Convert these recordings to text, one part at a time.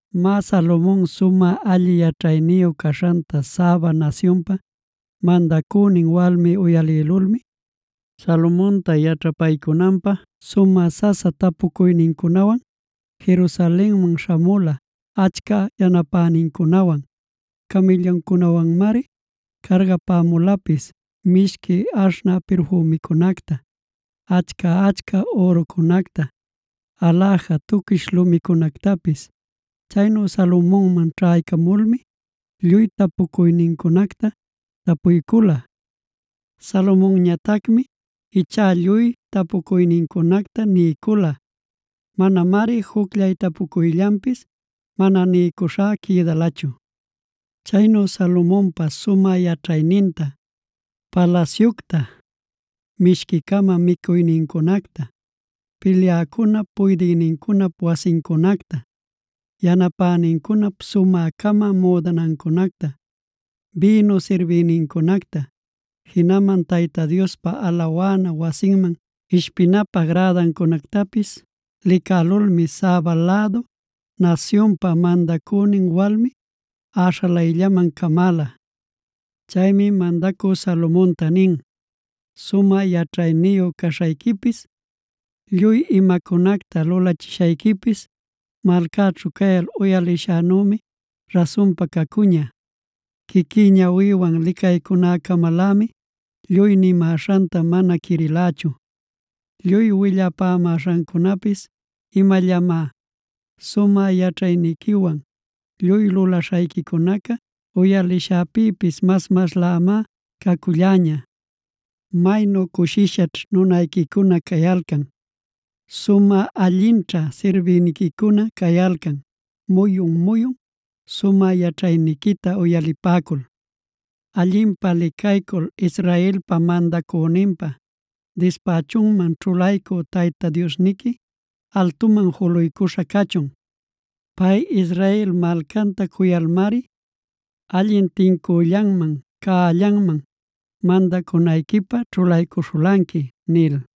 Má, Salomon sumä alli yaćhayniyu caśhanta Saba nasyunpa mandacünin walmi uyalïlulmi, Salomonta yaćhapaycunanpä sumä sasa tapucuynincunwan, Jerusalenman śhamula achca yanapänincunawan. Camïlluncunawanmari cargapämulapis mishqui aśhnä pirfümicunacta, achca-achca ürucunacta, aläja tuquish lumicunactapis. Chaynu Salomonman ćhaycamulmi lluy tapucuynincunacta tapuycula. Salomonñatacmi ichá lluy tapucuynincunacta niycula. Manamari jucllay tapucuyllanpis mana niycuśhá quïdalachu. Chaynu Salomonpa sumä yaćhayninta, palasyucta, mishqui-cama micuynincunacta, pilyäcunap puydïnincunap wasincunacta, yanapänincunap sumä-cama müdanancunacta, bïnu sirbïnincunacta, jinaman Tayta Diospa alawana wasinman ishpinapä grädancunactapisa licälulmi, Saba lädu nasyunpa mandacünin walmi äśhalayllaman camäla. Chaymi mandacü Salomonta nin: “Sumä yaćhayniyu caśhayquipis, lluy imacunacta lulachishayquipis malcäćhu cayal uyalishänümi rasunpa cacuña. Quiquí ñawïwan licaycunäcamalämi lluy nimäśhanta mana quirilächu; lluy willapämäśhancunapis imallamá. Sumä yaćhayniquiwan lluy lulaśhayquicunaca uyalishäpïpis mas-maslämá caculläña. ¡Maynu cushishaćh nunayquicuna cayalcan! ¡Sumä allinćha sirbïniquicuna cayalcan muyun-muyun sumä yaćhayniquita uyalipäcul! ¡Allinpä licaycul, Israelpa mandacüninpä dispächunman ćhulaycü Tayta Diosniqui altuman juluycuśha cachun! Pay, Israel malcanta cuyalmari allin tincüllanman, cällanman mandacunayquipä ćhulaycuśhulanqui” nil.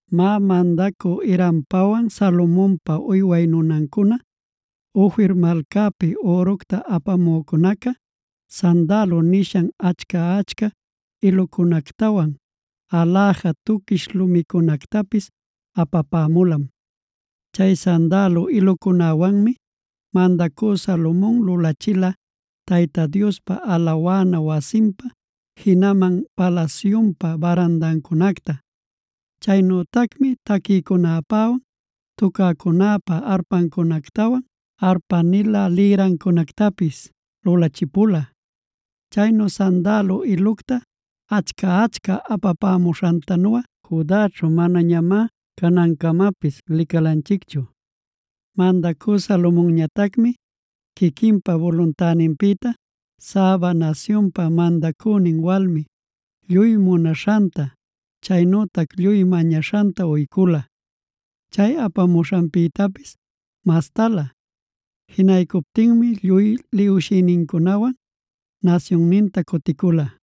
(Má, mandacü Hirampawan Salomonpa uyway nunancuna, Ofir malcapi üructa apamücunaca, sandalo nishan achca-achca ilucunactawan aläja tuquish lumicunactapis apapämulam. Chay sandalo ilucunäwanmi mandacü Salomon lulachila Tayta Diospa alawana wasinpä, jinaman palasyunpä barandancunacta. Chaynütacmi taquïcunäpäwan tucäcunäpä arpancunactawan arpa-nilä lïrancunactapis lulachipula. Chaynu sandalo ilucta achca-achca apapämuśhantanuꞌa Judaćhu manañamá canancamapis licalanchicchu.) Mandacü Salomonñatacmi, quiquinpa buluntäninpïta Saba nasyunpa mandacünin walmi lluy munaśhanta chaynütac lluy mañaśhanta uycula, chay apamuśhanpïtapis mastalä. Jinaycuptinmi lluy liwshïnincunawan nasyunninta cuticula.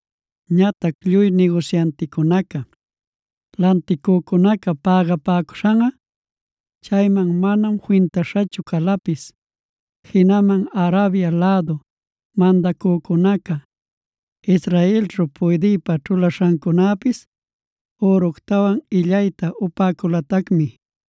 Ñatac lluy nigusyanticunaca, lanticücunaca pägapäcuśhanꞌa chayman manam fintaśhachu calapis. Jinaman Arabia lädup mandacücunaca, Israelćhu puydïpa ćhulaśhacunäpis üructawan illayta upäculatacmi.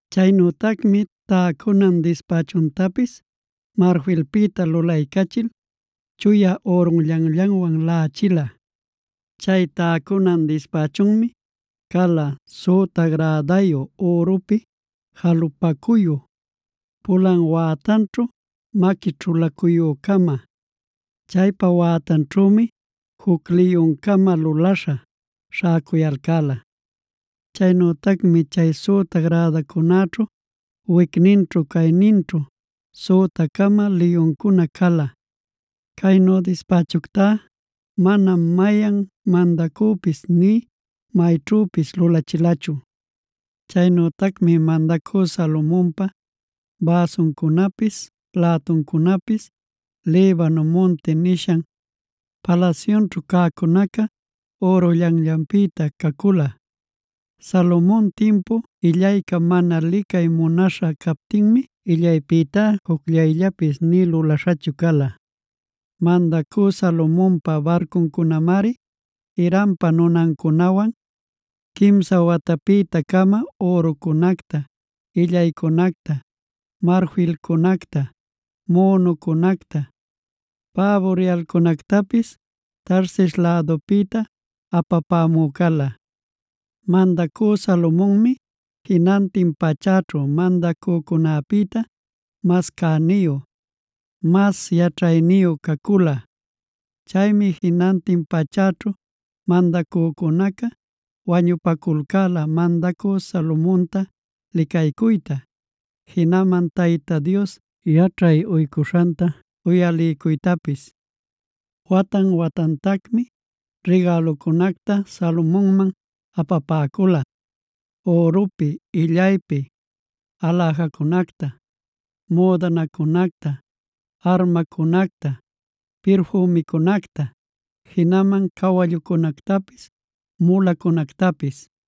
Chaynütacmi täcunan dispächuntapis marfilpïta lulalcachil chuya ürunllanllanwan laꞌachila. Chay täcunan dispächunmi cala: süta gradayu, ürupi jalupacuyu, pulan wätanćhu maqui ćhulacuyü-cama. Chaypa wätanćhümi juc liyun-cama luläśha śhäcuyalcäla. Chaynütacmi chay süta grädacunäćhu wicninćhu-cayninćhu süta-cama liyuncuna cala. Caynu dispächuctá manam mayan mandacüpis nï mayćhüpis lulachilachu. Chaynütacmi mandacü Salomonpa bäsuncunapis, lätuncunapis, Libano Munti nishan palasyunćhu cäcunaca ürunllanllanpïta cacula. Salomon timpu illayca mana licay munaśha captinmi illaypïtá jucllayllapis nï lulaśhachu cala. Mandacü Salomonpa barcuncunamari Hirampa nunancunawan quimsa watapïta-cama ürucunacta, illaycunacta, marfilcunacta, münucunacta, päbu riyalcunactapis Tarsis lädupïta apapämü cala. Mandacü Salomonmi jinantin pachäćhu mandacücunäpïta mas cäniyu, mas yaćhayniyu cacula. Chaymi jinantin pachäćhu mandacücunaca wañupaculcäla mandacü Salomonta licaycuyta, jinaman Tayta Dios yaćhay uycuśhanta uyaliycuytapis. Watan-watantacmi rigälucunacta Salomonman apapäcula: ürupi illaypi aläjacunacta, müdanacunacta, armacunacta, pirfümicunacta, jinaman cawallucunactapis, mulacunactapis.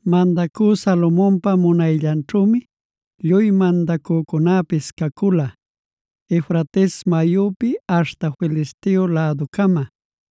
Mandacü Salomonpa munayllanćhümi lluy mandacücunäpis cacula, Eufrates mayupi aśhta Filisteo läducama,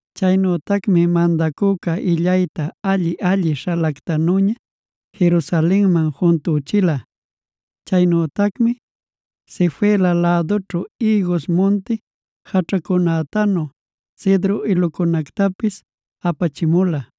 Chaynütacmi mandacüca illaytad alli-alli śhalactanüña Jerusalenman juntüchila. Chaynütacmi Sefela lädućhu ïgus munti jaćhacunätanu cedro ilucunactapis apachimula.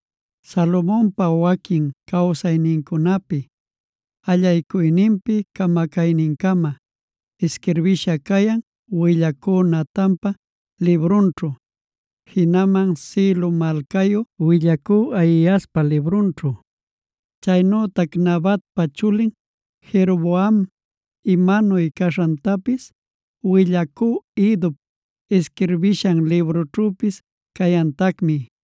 Salomonpa waquin cawsaynincunapi allaycuyninpi camacaynincama isquirbisha cayan, willacü Natanpa librunćhu, jinaman Silo malcayü willacü Ahiaspa librunćhu. Chaynütac Nabatpa chulin Jeroboam imanuy caśhantapis willacü Iddop isquirbishan librućhüpis cayantacmi.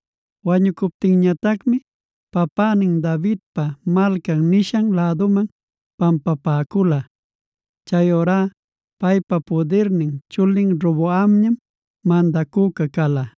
Wañucuptinñatacmi papänin Davidpa Malcan nishan läduman pampapäcula. Chayurá paypa pudirnin chulin Roboamñam mandacüca cala.